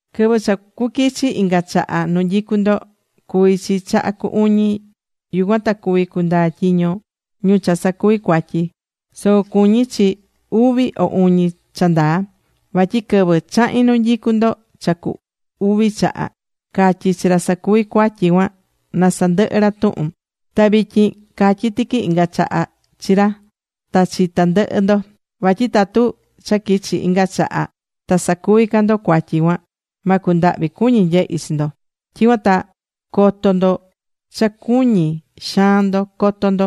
Quɨvɨ cha cuquichi inga chaha nu nyicu ndo cuví chi chaha cu uñi. Yucuan ta cuvi cundaa tyiño ñu cha sacuví cuatyi. Soco cuñí chi uvi o uñi cha ndaa. Vatyi quɨvɨ chahi̱n nu nyicú ndo cha cu uvi chaha, catyi̱ chi ra sacuví cuatyi cuan, na sandɨhɨ ra tuhun. Ta vityin catyí tiqui inga chaha chi ra, ta chi tandɨhɨ ndo. Vatyi tatu cha quichi inga chaha, ta sacuví ca ndo cuatyi cuan, ma cundahvi cuñi nyehi chi ndo. Tyicuan ta coto ndo cha cuñí xaan ndo coto ndo.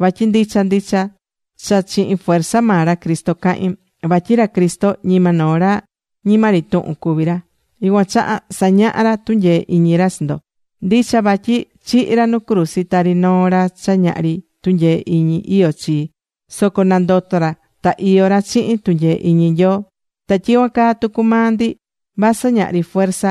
Vatyi ndicha ndicha cha chihin fuerza maa ra Cristo cahín. Vatyi ra Cristo ñima noo ra ñima ri tuhun cuví ra. Yucuan chaha sañahá ra tunyee iñi ra chi ndo. Ndicha vatyi chihi̱ ra nu cruzi tari noo ra cha ñahri tunyee iñi iyó chii. Soco nandoto̱ ra ta iyó ra chihin tunyee iñi Nyoo. Ta tyicuan caa tucu maa ndi vasɨ ñahri fuerza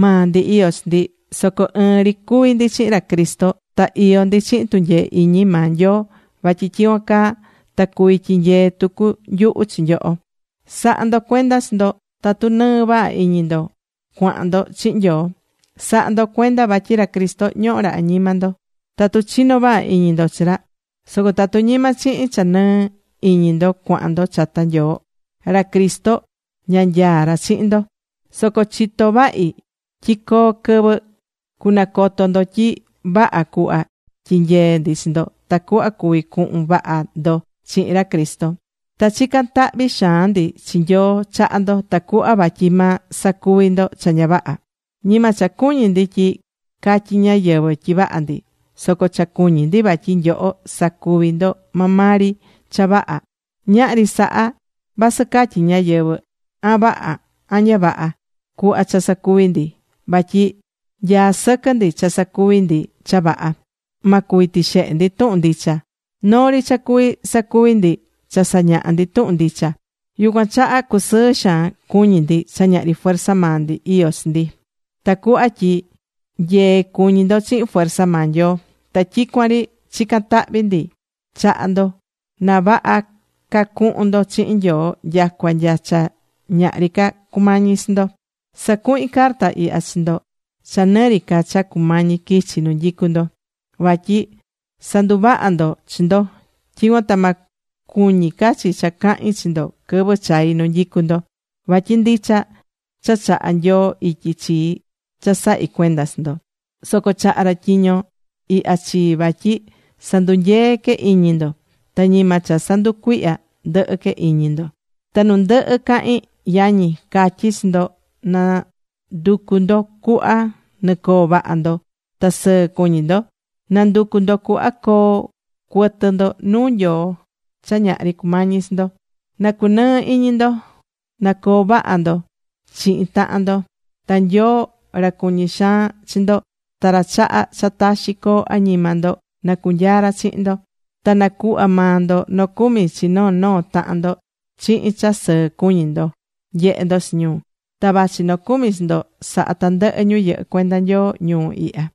maa ndi iyó chi ndi. Soco ɨɨn ri cuví ndi chihin ra Cristo. Ta iyó ndi chihin tunyee iñi maa Nyoo vatyi tyicuan caa ta cuvi tyinyee tucu nyuhu chi nyoho. Sa̱ha ndo cuenda chi ndo tatu nɨɨ vaha iñi ndo cuahán ndo chihin Nyoo. Sa̱ha ndo cuenda vatyi ra Cristo ñohó ra añima ndo tatu chinó vaha iñi ndo chi ra. Soco tatu ñima chihin cha nɨɨ iñi ndo cuahán ndo chata Nyoo, ra Cristo ña nyaá ra chihin ndo. Soco chitó vahi tyi coo quɨvɨ cunacoto ndo tyi vaha cuhva tyinyeé ndi chi ndo tacuhva cuví cuhun vaha ndo chihin ra Cristo. Ta chicán tahvi xaan ndi chi Nyoo chaha ndo, tacuhva vatyi ma sacuvi ndo cha ña vaha. Ñima cha cuñí ndi tyi catyi ñáyɨvɨ tyi vaha ndi. Soco cha cuñí ndi vatyi nyoho sacuví ndo maa maa ri cha vaha. Ñahri saha vasɨ catyí ñáyɨvɨ, an vaha, an ña vaha cuhva cha sacuví ndi. Vatyi nyaá sɨquɨ ndi cha sacuví ndi cha vaha. Ma cuvi tixehe ndi tuhun ndicha. Noo ri cha cuví sacuvi ndi, cha sañahá ndi tuhun ndicha. Yucuan chaha cusɨɨ xaan cuñí ndi cha ñahri fuerza maa ndi iyó chi ndi, ta cuhva tyi nyee cuñí ndo chihin fuerza maa Nyoo. Ta tyicuan ri chicán tahvi ndi chaha ndo na vaha ca cuhun ndo chihin Nyoo nyacua nya cha ñahri ca cumañi chi ndo. Sacuhín carta ihya chi ndo cha nɨ ri ca cha cumañi quichi nu nyicú ndo. Vatyi sa̱nduvaha ndo chi ndo. Tyicuan ta ma cuñi ca chi cha cahín chi ndo quɨvɨ chai nu nyicu ndo. Vatyi ndicha cha chaha̱ Nyoo ityi chii cha sahí cuenda chi ndo. Soco chaha̱ ra tyiño ihya chii vatyi sandunyeé que iñi ndo. Ta ñima cha sanducuihyá ndɨhɨ que iñi ndo. Ta nu ndɨhɨ cahín, yañi, catyí chi ndo, na nducu ndo cuhva nɨcoo vaha ndo ta sɨɨ cu̱ñi ndo. Na̱nducu ndo cuhva coo cuɨtɨ ndo nuu Nyoo cha ñahri cumañi chi ndo. Na cunɨɨ iñi ndo, na coo vaha ndo chihin tahan ndo. Ta Nyoo ra cuñí xaan chi ndo, ta ra chahá cha taxi coo añima ndo na cunyaa ra chihin ndo. Ta nacuhva maa ndo nocumi chi noo noo tahan ndo chihin cha sɨɨ cuñí ndo nyehé ndo chi ñu. Ta vachí nocumi chi ndo sahá tandɨhɨ ñu yɨhɨ́ cuenda Nyoo ñuu ihya.